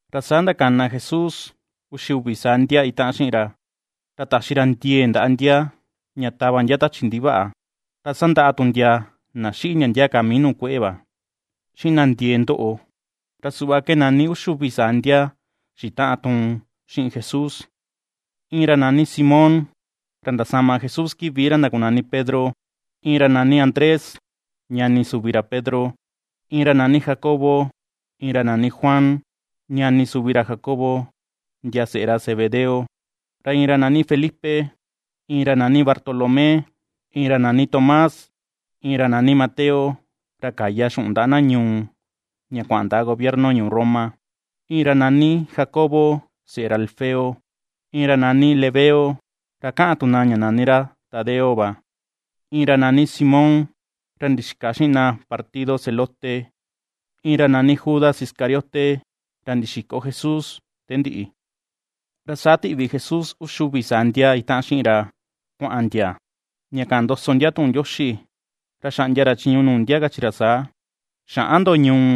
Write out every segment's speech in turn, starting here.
Ra saa ndakana Jesús uxi uvi saa ndia itaꞌan xiꞌin ra, ra taxi ra ndiee ndaꞌa ndia ña tava ndia tachi ndivaꞌa, ra sandaꞌa tu ndia na xiꞌi ndia ndia ka mii kueꞌe va, xiꞌin na ndiee ni ndoꞌo. Ra suꞌva ke nani uxi uvi saa ndia xitaꞌan tuun xiꞌin Jesús: Iin ra nani Simón, ra ndasama Jesús kivi ra ndakunani Pedro, iin ra nani Andrés, ñani suvi ra Pedro, iin ra nani Jacobo, iin ra nani Juan, ñani suvi ra Jacobo, ndia seꞌe ra Zebedeo; Ra iin ra nani Felipe, iin ra nani Bartolomé, iin ra nani Tomás, iin ra nani Mateo, ra kaya xuꞌun ndaꞌa na ñuu ña kuaꞌan ndaꞌa Gobierno ñuu Roma; iin ra nani Jacobo, seꞌe ra Alfeo, iin ra nani Lebeo, ra kaꞌan tu na ña nani ra Tadeo va. Iin ra nani Simón ra ndixika xiꞌin na partido Zelote, iin ra nani Judas Iscariote, ra ndixiko Jesús te ndiꞌi. Ra saa tiꞌvi Jesús uxi uvi saa ndia itaꞌan xiꞌin ra kuaꞌan ndia, ña kaꞌan ndoso ndia tuꞌun Ndioxi, ra xaꞌndia ra chiñu nuu ndia kachi ra saa: ―Xäꞌan ndo ñuu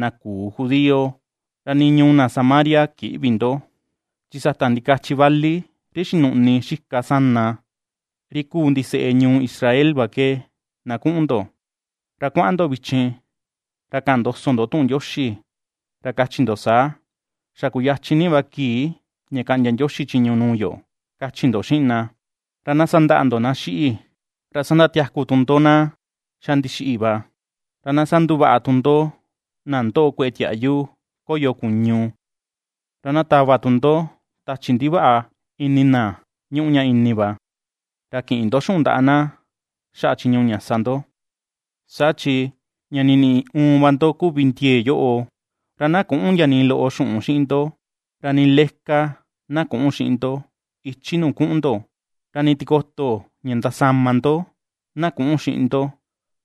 na küu judío, ra nii ñuu na Samaria kïꞌvi ndo, chi sata ndikachi vali ri xinuꞌni xika sana, ri kuu ndiseꞌe ñuu Israel va ke na kuꞌun ndo. Ra kuaꞌan ndo vichin ra kaꞌan ndoso ndo tuꞌun Ndioxi ra kachi ndo saa: “Xa kuyachin ni va kii ña kaꞌndia Ndioxi chiñu nuu yo”, kachi ndo xiꞌin na. Ra na sandaꞌa ndo na xiꞌi, ra sandatiaku tu ndo na xa ndixiꞌi va, ra na sanduvaꞌa tu ndo na ndoꞌo kueꞌe tiaꞌyu koyo kuñu, ra na tava tu ndo tachi ndivaꞌa ini na ñuꞌu ña ini va. Ra kïꞌin ndo xuꞌun ndaꞌa na xaꞌa chiñu ña sa ndo, saa chi ña niniꞌi uun va ndo kuvi ndiee yoꞌo. Ra na küꞌun ndia nii loꞌo xuꞌun xiꞌin ndo, ra nii leka na küꞌun xiꞌin ndo ichi nuu kuꞌun ndo. Ra nii tikoto ña ndasama ndo na küꞌun xiꞌin ndo,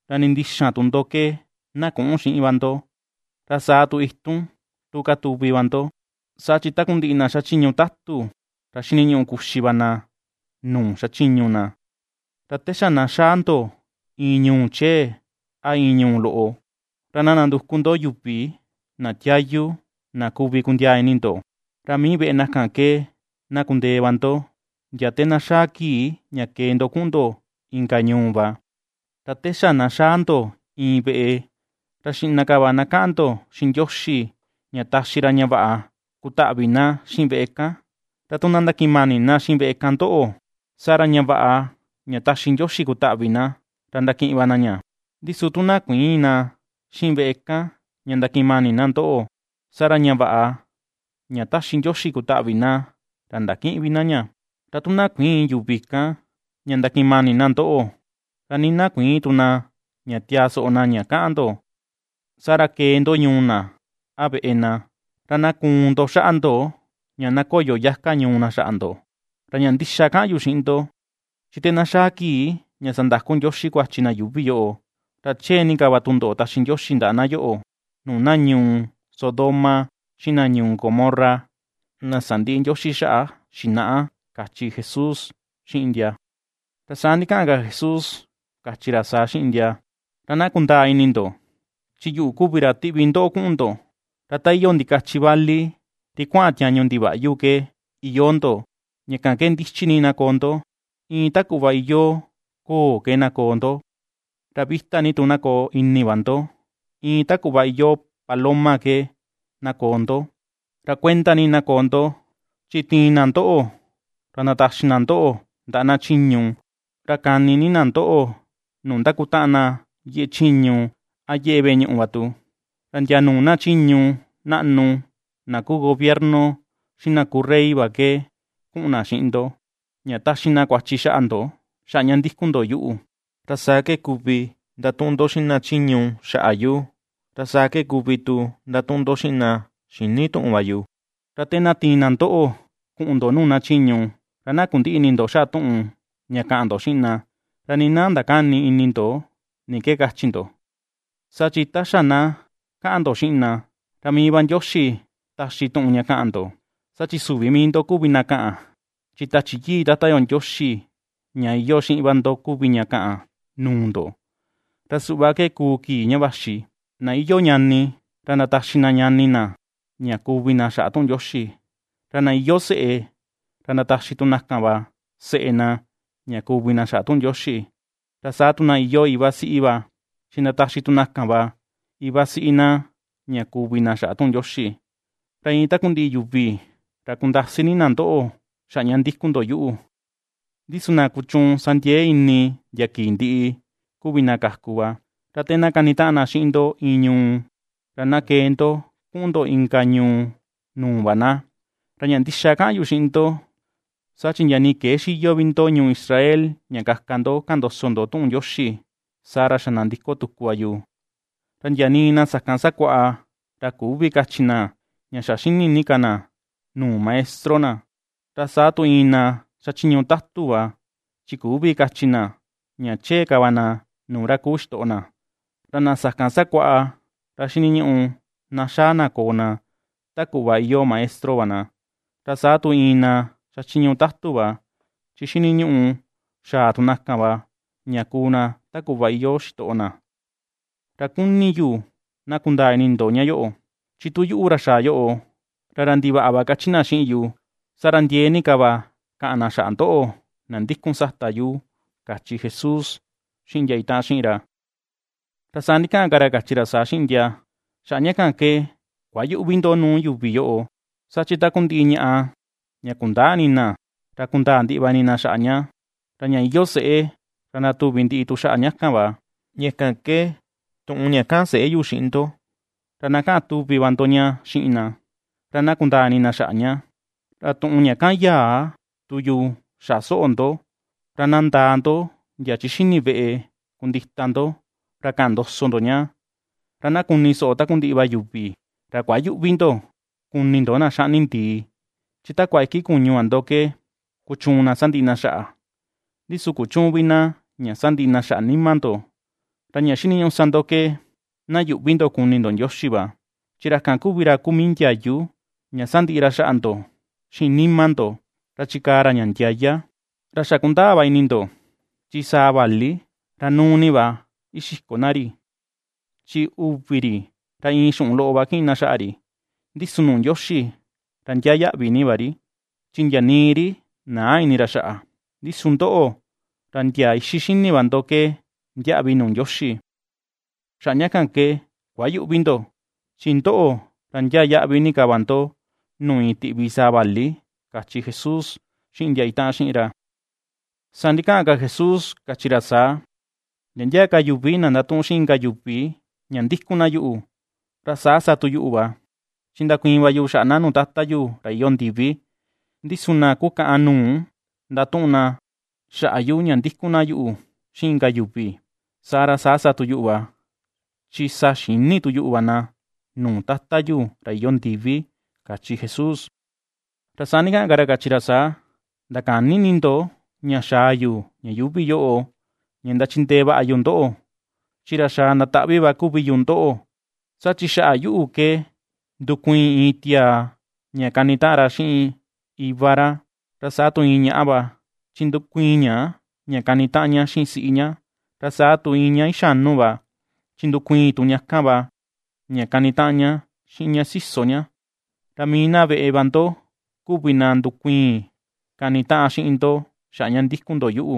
ra nii ndixan tu ndo ke na küꞌun xiꞌin va ndo, ra saa tu itun tu katuvi va ndo, saa chi takundiꞌi na xachiñu tatu ra xiniñuꞌu kuxi va na nuu xachiñu na. Ra te xa na xaa ndo iin ñuu chee, a iin ñuu loꞌo, ra na nanduku ndo yuvi na tiayu na kuvi kundiaa ini ndo, ra mii veꞌe na kan ke na kundee va ndo ndia te na xaa kii ña kee ndo kuꞌun ndo inka ñuu va. Ra te xa na xaa ndo iin veꞌe, ra xiꞌna ka va ná kaꞌan ndo xiꞌin Ndioxi ña taxi ra ña vaꞌa kutaꞌvi na xiꞌin veꞌe kan. Ra tu na ndakiꞌin mani na xiꞌin veꞌe kan ndoꞌo, saa ra ña vaꞌa ña taxi Ndioxi kutaꞌvi na, ra ndakiꞌin va na ña. Ndi su tu na kuïin na xiꞌin veꞌe kan ña ndakiꞌin mani na ndoꞌo, saa ra ña vaꞌa ña ^taxi Ndioxi kutaꞌvi na ra ndakïꞌin vi na ña. Ra tu na kuïin yuvi kan ña ndakiꞌin mani na ndoꞌo, ra nii na kuïin tu na ña tiaa soꞌo na ña kaꞌan ndo, saa ra kee ndo ñuu na, a veꞌe na, ra na kuun ndo xaꞌa ndo ña na koyo yaka ñuu na xaꞌa ndo. Ra ña ndixa ke kaꞌan yu xiꞌin ndo, chi te na xaa kii ña sandaku Ndioxi kuachi na yuuvi yoꞌo, ra chee ni ka tundoꞌo taxi Ndioxi ndaꞌa na yoꞌo, nuu na ñuu Sodoma xiꞌin na ñuu Gomorra na sandiꞌi Ndioxi xaꞌa xinaꞌa ―kachi Jesús xiꞌin ndia. Ra saa ndikaꞌan ka Jesús kachi ra saa xiꞌin ndia: ―¡Ra na kundaa ini ndo! Chi yuꞌu kuvi ra tiꞌvi ndoꞌo kuꞌun ndo, ra ta iyoo ndikachi vali ri kuaꞌan tiañu ndivaꞌyu ke iyoo ndo. Ña kan ke ndichi ni na koo ndo iin ta kuꞌva iyoo ko̱o̱ ke, na koo ndo; ra vita ni tu na koo ini va ndo, iin ta kuꞌva iyoo paloma ke, na koo ndo. Ra kuenda ni na koo ndo, chi tiin na ndoꞌo ra ndataxi na ndoꞌo ndaꞌa na chiñu, ra kani ni na ndoꞌo nuu ndakutaꞌan na yeꞌe chiñu a yeꞌe veꞌe ñuꞌu va tu. Ra ndia nuu na chiñu naꞌnu na kuu gobierno xiꞌin na kuu rey va ke kuꞌun na xiꞌin ndo, ña taxi na kuachi xaꞌa ndo xaꞌa ña ndikun ndo yuꞌu; ra saa ke kuvi ndatuꞌun ndo xiꞌin na chiñu xaꞌa yu, ra saa ke kuvi tu ndatuꞌun ndo xiꞌin na xïni tuꞌun va yu. Ra te na tiin na ndoꞌo kuꞌun ndo nuu na chiñu, ra na kundïꞌi ini ndo xaꞌa tuꞌun ña kaꞌan ndo xiꞌin na, ra nii na ndakäni ini ndo ni ke kachi ndo, saa chi ta xa na kaꞌan ndo xiꞌin na, ra mii va Ndioxi taxi tuꞌun ña kaꞌan ndo. Saa chi süvi mii ndo kuvi ndo kaꞌan, chi Tachi Yii Tata yo Ndioxi ña iyoo xiꞌin va ndo kuvi ña kaꞌan nuu ndo. Ra suꞌva ke kuu kii ña vaxi, na iyoo ñani, ra ndataxi na ñani na ña kuvi na xaꞌa tuꞌun Ndioxi; ra na iyoo seꞌe ra ndataxi tu na kan va seꞌe na ña kuvi na xaꞌa tuꞌun Ndioxi; ra sa tu na iyoo iva siꞌi va chi ndataxi tu na kan va iva siꞌi na ña kuvi na xaꞌa tuꞌun Ndioxi. Ra iin takundiꞌi yuvi ra kundasi ni na ndoꞌo xaꞌa ña ndikun ndo yuꞌu; ndi su na kuchuun sa ndiee ini ndia kii ndiꞌi, kuvi na kaku va. Ra te na kanitaꞌan na xiꞌin ndo iin ñuu, ra na kee ndo kuꞌun ndo inka ñuu nuu va na, ra ña ndixa ke kaꞌan yu xiꞌin ndo, saa chi ndia nii këe xiyo vi ndo ñuu Israel ña kaka ndo kaꞌan ndoso tuꞌun Ndioxi, saa ra xa nandiko tuku va yu. ’Ra ndia nii na sakan sakuaꞌa ra küvi kachi na ña xini ka na nuu maestro na, ra saa tu iin na xachiñu tatu va chi küvi kachi na ña chee ka na nuu ra kuu xitoꞌo na. Ra na sakan sakuaꞌa ra xiniñuꞌu na xaa na koo na ta kuꞌva iyoo maestro va na, ra saa tu iin na xachiñu tatu va chi xiniñuꞌu xaa tu na kan va ña kuu na ta kuꞌva iyoo xitoꞌo na. Ra kuni yu na kundaa ini ndo ña yoꞌo: chi tu yuꞌu, ra xaa yoꞌo, ra “ra ndivaꞌa” va kachi na xiꞌin yu, saa ra ndiee ni ka va kaꞌan na xaꞌa ndoꞌo, na ndikun sata yu ―kachi Jesús xiꞌin ndia itaꞌan xiꞌin ra. Ra saa ndikaꞌan ka ra kachi ra saa xiꞌin ndia: ―Xaꞌa ña kan ke, kuayüꞌvi ndo nuu yuvi yoꞌo. Saa chi takundiꞌi ñaꞌa ña kundäa ini na, ra kundaa ndiꞌi va ini na xaꞌa ña, ra ña iyoo seꞌe ra ndatuvi ndiꞌi tu xaꞌa ña kan va. Ña kan ke, tuꞌun ña kaꞌan seꞌe yu xiꞌin ndo, ra na kaꞌan tuvi va ndo ña xiꞌin na, ra na kundaa ini na xaꞌa ña; ra tuꞌun ña kaꞌan yaa tu yu xaꞌa soꞌo ndo, ra na ndaa ndo ndia chi xini veꞌe kundita ndo ra kaꞌan ndoso ndo ña, ra na kuni soꞌo takundiꞌi va yuvi. Ra kuayüꞌvi ndo kuni ndo na xaꞌni ndii, chi takua iki kuñu va ndo ke kuchuun na sandiꞌi na xaꞌa, ndi su kuchüun vi na ña sandiꞌi na xaꞌa nima ndo, ra ña xiniñuꞌu sa ndo ke, na yuꞌvi ndo kuni ndo Ndioxi va, chi ra kan kuvi ra kuu mii ndiayu ña sandiꞌi ra xaꞌa ndo xiꞌin nima ndo ra chikaa ra ña ndiaya. Ra xa kundaa va ini ndo chi saa vali, ra núú ni va ixiko na ri, chi uvi ri ra iin xuꞌun loꞌo va kiꞌin na xaꞌa ri, ndi su nuu Ndioxi ra ndiaa yaꞌvi ni va ri, chi ndia nii ri näa ini ra xaꞌa. Ndi su ndoꞌo, ra ndia ixi xini va ndo ke ndiaꞌvi nuu Ndioxi. Xaꞌa ña kan ke kuayüꞌvi ndo: chi ndoꞌo ra ndiaa yaꞌvi ni ka va ndo nuu iin tiꞌvi saa vali ―kachi Jesús xiꞌin ndia itaꞌan xiꞌin ra. Saa ndikaꞌan ka Jesús kachi ra saa: ―Ndia ndia ka yuvi na ndatuꞌun xiꞌin inka yuvi ña ndikun na yuꞌu, ra saa sa tu yuꞌu va, chi ndakuiin va yu xaꞌa na nuu Tata yu ra iyoo ndivi. Ndi su na kukaꞌan nuu ndatuꞌun na xaꞌa yu ña ndikun na yuꞌu xiꞌin inka yuvi, saa ra saa sa tu yuꞌu va, chi sa xïni tu yuꞌu va na nuu Tata yu ra iyoo ndivi ―kachi Jesús. Ra saa ndikaꞌan ka ra kachi ra saa: ―Ndakäni ini ndo ña xaa yu ña yuuvi yoꞌo ña ndachindee vaꞌa yu ndoꞌo, chi ra xaa ndataꞌvi va kuvi yu ndoꞌo. Saa chi xaꞌa yuꞌu ke ndukuiin iin tiaa ña kanitaꞌan ra xiꞌin iva ra, ra saa tu iin ñaꞌa va, chi ndukuiin ña, ra kanitaꞌan ña xiꞌin siꞌi ña, ra saa tu iin ña ixanu va, chi ndukuiin tu ña kan va, ña kanitaꞌan ña xiꞌin ña siso ña. Ra mii na veꞌe va ndo kuvi na ndukuiin kanitaꞌan xiꞌin ndo xaꞌa ña ndikun ndo yuꞌu.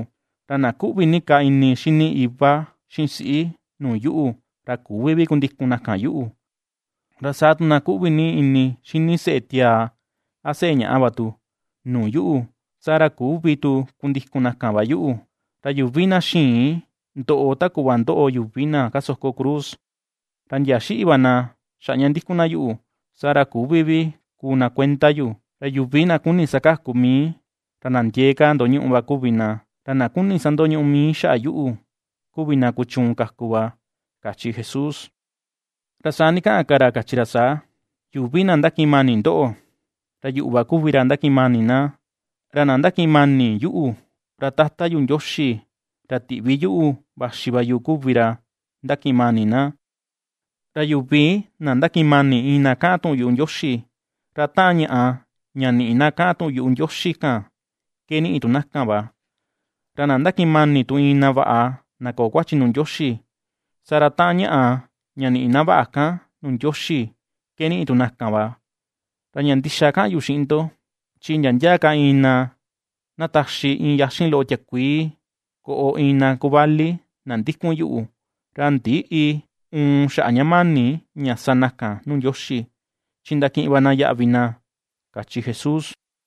Ra na kuꞌvi ni ka ini xini iva xiꞌin siꞌi, nuu yuꞌu, ra küvi vi kundikun na kan yuꞌu, ra saa tu na kuꞌvi ni ini xini seꞌe tiaa a seꞌe ñaꞌa va tu, nuu yuꞌu, saa ra küvi tu kundikun na kan va yuꞌu; ra yuvi na xïin ndoꞌo ta kuꞌva ndoꞌo yuvi na kasoko cruz, ra ndia xiꞌi va na xaꞌa ña ndikun na yuꞌu, saa ra küvi vi kuu na kuenda yu. Ra yuvi na kuni sakaku mii, ra na ndiee ka ndoñuꞌu va kuvi na, ra na kuni sandoñuꞌu mii xaꞌa yuꞌu, kuvi na kuchuun kaku va ―kachi Jesús. Ra saa ndikaꞌan ka ra kachi ra saa: ―Yuvi na ndakiꞌin mani ndoꞌo, ra yuꞌu va kuvi ra ndakiꞌin mani na; ra na ndakiꞌin mani yuꞌu, ra Tata yu Ndioxi ra tiꞌvi yuꞌu vaxi va yu kuvi ra ndakiꞌin mani na. Ra yuvi na ndakiꞌin mani iin na kaꞌan tuꞌun yuꞌu Ndioxi, ra taꞌan ñaꞌa, ña niꞌi na kaꞌan tuꞌun yuꞌu Ndioxi kan ke niꞌi tu na kan va, ra na ndakiꞌin mani tu iin na vaꞌa na köo kuachi nuu Ndioxi, saa ra taꞌan ñaꞌa, ña niꞌi na vaꞌa kan nuu Ndioxi, ke niꞌi tu na kan va. Ra ña ndixa kaꞌan yu xiꞌin ndo, chi ndia ndia ka iin na na taxi iin yaxin loꞌo tiakuii koꞌo iin na kuvali, na ndikun yuꞌu, ra ndïꞌi uun xaꞌa ña mani ña sa na kan nuu Ndioxi, chi ndakiꞌin va na yaꞌvi na ―kachi Jesús.